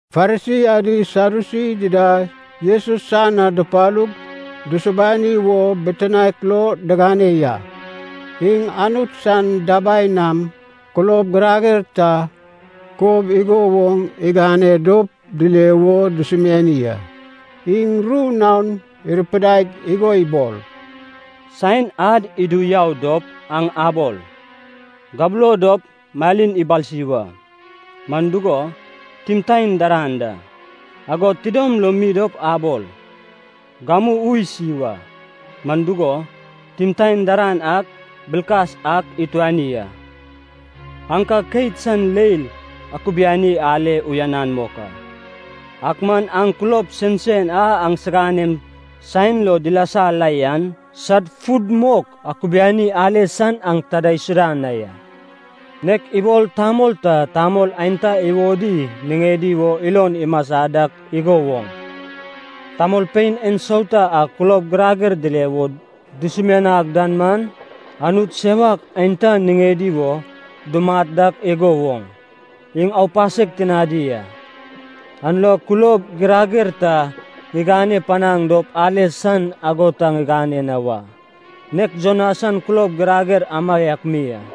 Farisi adi Sadyusi dida Jesus san na dupalug dusubani wo bitinaek lo digane ya. Iŋ Anut san dabai nam kulob girager ta kob igo woŋ igane dop dile wo dusumiani a. Iŋ ru naon irupidaig igo ibol, “Saen ad idu yau dop aŋ abol, ‘Gabulo dop malin ibalsi wa,’ man dugo, timtaen daran da. Agod tidom lo mi dop abol, ‘Gamu ui isi wa,’ man dugo, timtaen daran an bilkas ak ituani a. Aŋ ka keit san leil akubiani ale uyanan mok a, ak man aŋ kulob sensen a aŋsiganem saen lo dilasa la yan, sad fud mok akubiani ale san aŋ ta idaisuda na ya. Nek ibol tamol ta tamol aenta iwodi niŋedi wo ilon imasa dak igo woŋ, tamolpein ensauta a kulob girager dile wo dusumianag dan man, anut sewak aenta niŋedi wo dumat dak igo woŋ, iŋ aupasek tinadi a. An lo kulob girager ta ŋigane panaŋ dop ale san ago ta ŋigane na wa, nek Jona san kulob girager amaiak mi a.”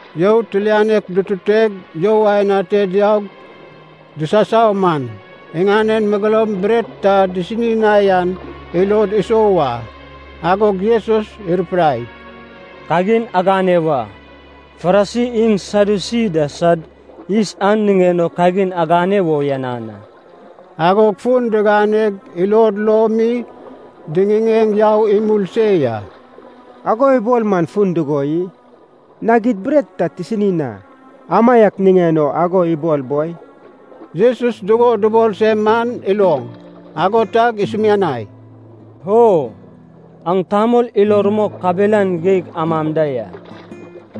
You tilianek dututeg you aen ate diaug disasau man, iŋanen megeloum bret ta disini na yan ilod isou a. Agog Jesus irupidai, “Kagin agane wa, Farisi iŋ Sadyusi da sad yis an niŋen o kagin agane wo uyanan a.” Agog fun diganeg ilod lo mi diŋiŋeŋ yau imul se ya. “Ago ibol man fun dugo i? Nag id bret ta tisini na, amaiak niŋen o ago ibol boi.” Jesus dugo dubol se man iloŋ, ago tag isumianai, “O aŋ tamol ilo rumok kabelan geig amam da ya,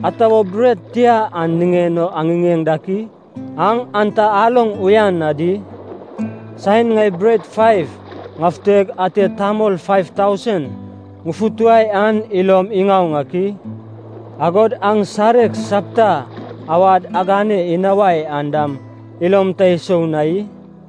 ata wo bret tia yan niŋen o aŋiŋeŋ dak i? Aŋ an ta aloŋ uyan na di? Saen ŋai bret faiv ŋafuteg ate tamol faiv tausen ŋufutuwai an ilom iŋaoŋ ak i? Agod aŋ sareg sapta awad agane inawai an dam ilom ta isou na i?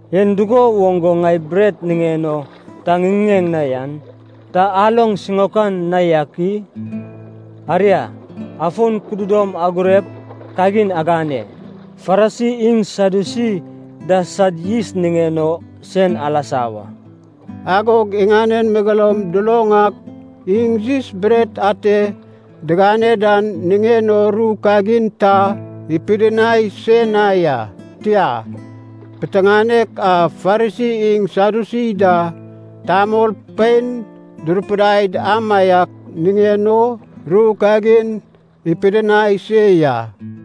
En dugo woŋ go ŋai bret niŋen o ta ŋiŋiŋen na yan, ta aloŋ siŋaokan na yak i? Aria, afon kududom agurep kagin agane: Farisi iŋ Sadyusi da sad yis niŋen o sen alasa wa.” Agog iŋanen megeloum duloŋ ak iŋ yis bret ate digane dan niŋen o ru kagin ta ipidinai se na ya. Tia, piteŋanek a Farisi iŋ Sadyusi da tamolpein durupidaid amaiak niŋen o ru kagin ipidinai se ya.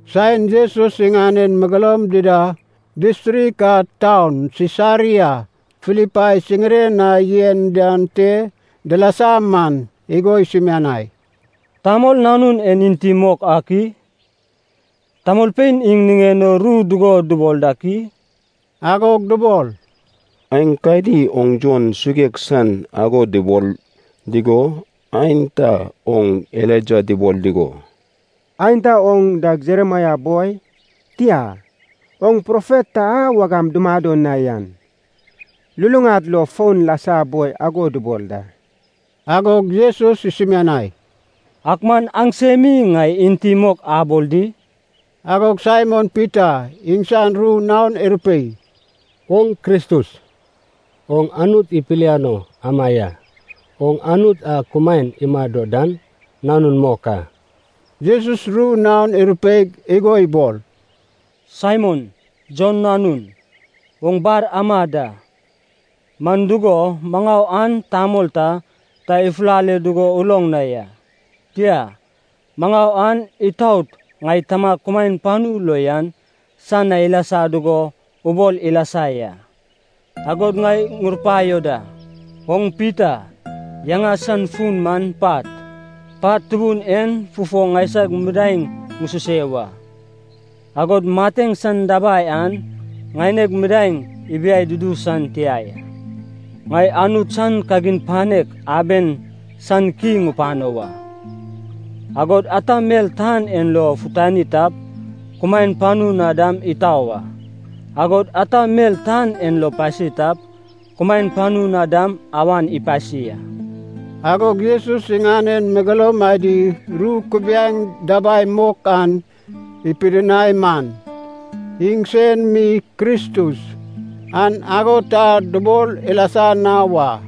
Saen Jesus iŋanen megeloum dida distrik a taun Sisaria Filipai siŋiren na yen dan te dilasa man, igo isumianai, “Tamol Nanun en enti mok ak i? Tamolpein iŋ niŋen o ru dugo dubol dak i?” Agog dubol, “Aenkadi oŋ Jon suguek san ago dubol dugo, aenta oŋ Elaija dubol dugo, aenta oŋ dag Jeremaia boi, tia, oŋ profet ta a wagam dumado na yan luluŋad lo fon lasa boi ago dubol da.” Agog Jesus isumianai, “Ak man aŋsem mi ŋai enti mok abol di?” Agog Saimon Pita iŋsan ru naon irupei, “Oŋ Kristus, oŋ Anut ipiliano ama ya, oŋ Anut a kumaen imado dan Nanun mok a.” Jesus ru naon irupeig igo ibol, “Saimon, Jon nanun, oŋ bar ama da, man dugo maŋau an tamol ta, ta ifulale dugo uloŋ na ya, tia, maŋau an itaot ŋai Tamag kumaen panu lo yan san na ilasa dugo ubol ilasa ya. Agod ŋai ŋurupaio da, oŋ Pita, yaŋa san fun man pat. Pat tubun en fufo ŋaisag midaeŋ ŋususe wa. Agod mateŋ san dabai an ŋaineg midaeŋ ibiai dudu san tia ya. Ŋai Anut san kagin panek aben san ki ŋupano wa, agod ata mel tan en lo futani tap, kumaen panu na dam itau a, agod ata mel tan en lo pasi tap, kumaen panu na dam awan ipasi a.” Agog Jesus iŋanen megeloum adi ru kubiaeŋ dabai mok an ipidinai man, iŋsen mi Kristus, an ago ta dubol ilasa na wa.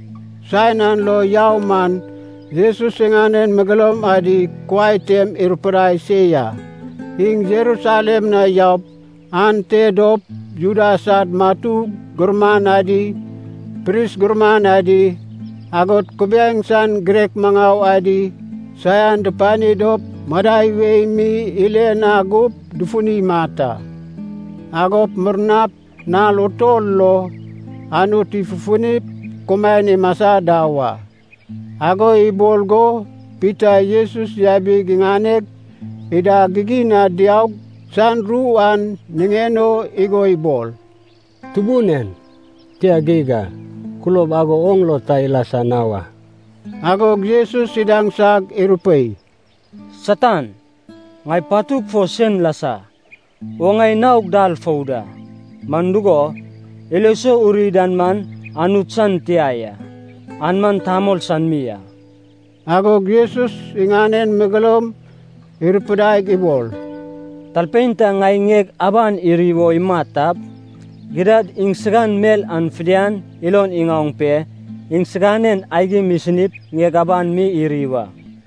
Saen an lo yau man Jesus iŋanen megeloum adi kuai tem irupidai se ya, iŋ Jerusalem na yaup ante dop Juda sad matu gurman adi, pris gurman adi, agod kubiaeŋ san girek maŋau adi saian dupani dop madai wei mi ile na gup dufuni imat a. Agop murnap nal utol lo Anut ifufunip kumaen imasa da wa. Ago ibol go Pita Jesus yabig iŋaneg ida gigin na diaug san ru an niŋen o igo ibol, “Tubun en, tia geig a, kulob ago oŋ lo ta ilasa na wa!” Agog Jesus idaŋsag irupei, “Satan, ŋai patug fo sen lasa! Oŋ ŋai naog dal fou da, man dugo, ilo sou uri dan man Anut san tia ya, an man tamol san mi a.” Agog Jesus iŋanen megeloum irupidaig ibol, “Talpein ta ŋai ŋieg aban iri wo imat tap, gidad iŋsan mel an fidian ilon iŋaoŋ pe iŋsiganen aigim isinip ŋieg aban mi iri wa.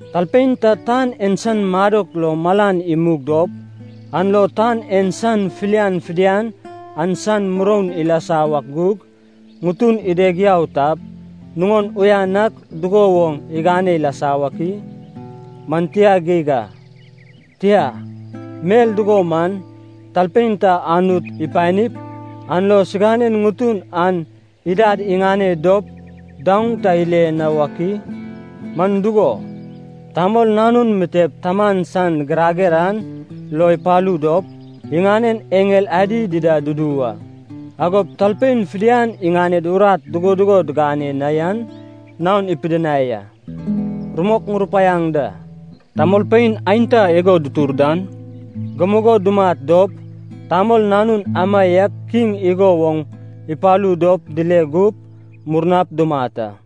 Talpein ta tan en san madok lo malan imug dop, an lo tan en san filian fidian an san muroun ilasa wak gug, ŋutun ideg yau tap, nuŋon uyan ak dugo woŋ igane ilasa wak i? Man tia geig a. Tia, mel dugo man, talpein ta Anut ipanip, an lo siganen ŋutun an idad iŋane dop daoŋ ta ile na wak i? Man dugo, Tamol Nanun mitep Taman san girager an lo ipalu dop, iŋanen eŋel adi dida dudu wa. Agop talpein fidian iŋaned urat dugo dugo digane na yan naon ipidinai a. Rumok ŋurupaiaŋ da, tamolpein aenta igo dutur dan gamugo dumat dop, Tamol Nanun amaiak Kiŋ igo woŋ ipalu dop dile gup, murnap dumat a.”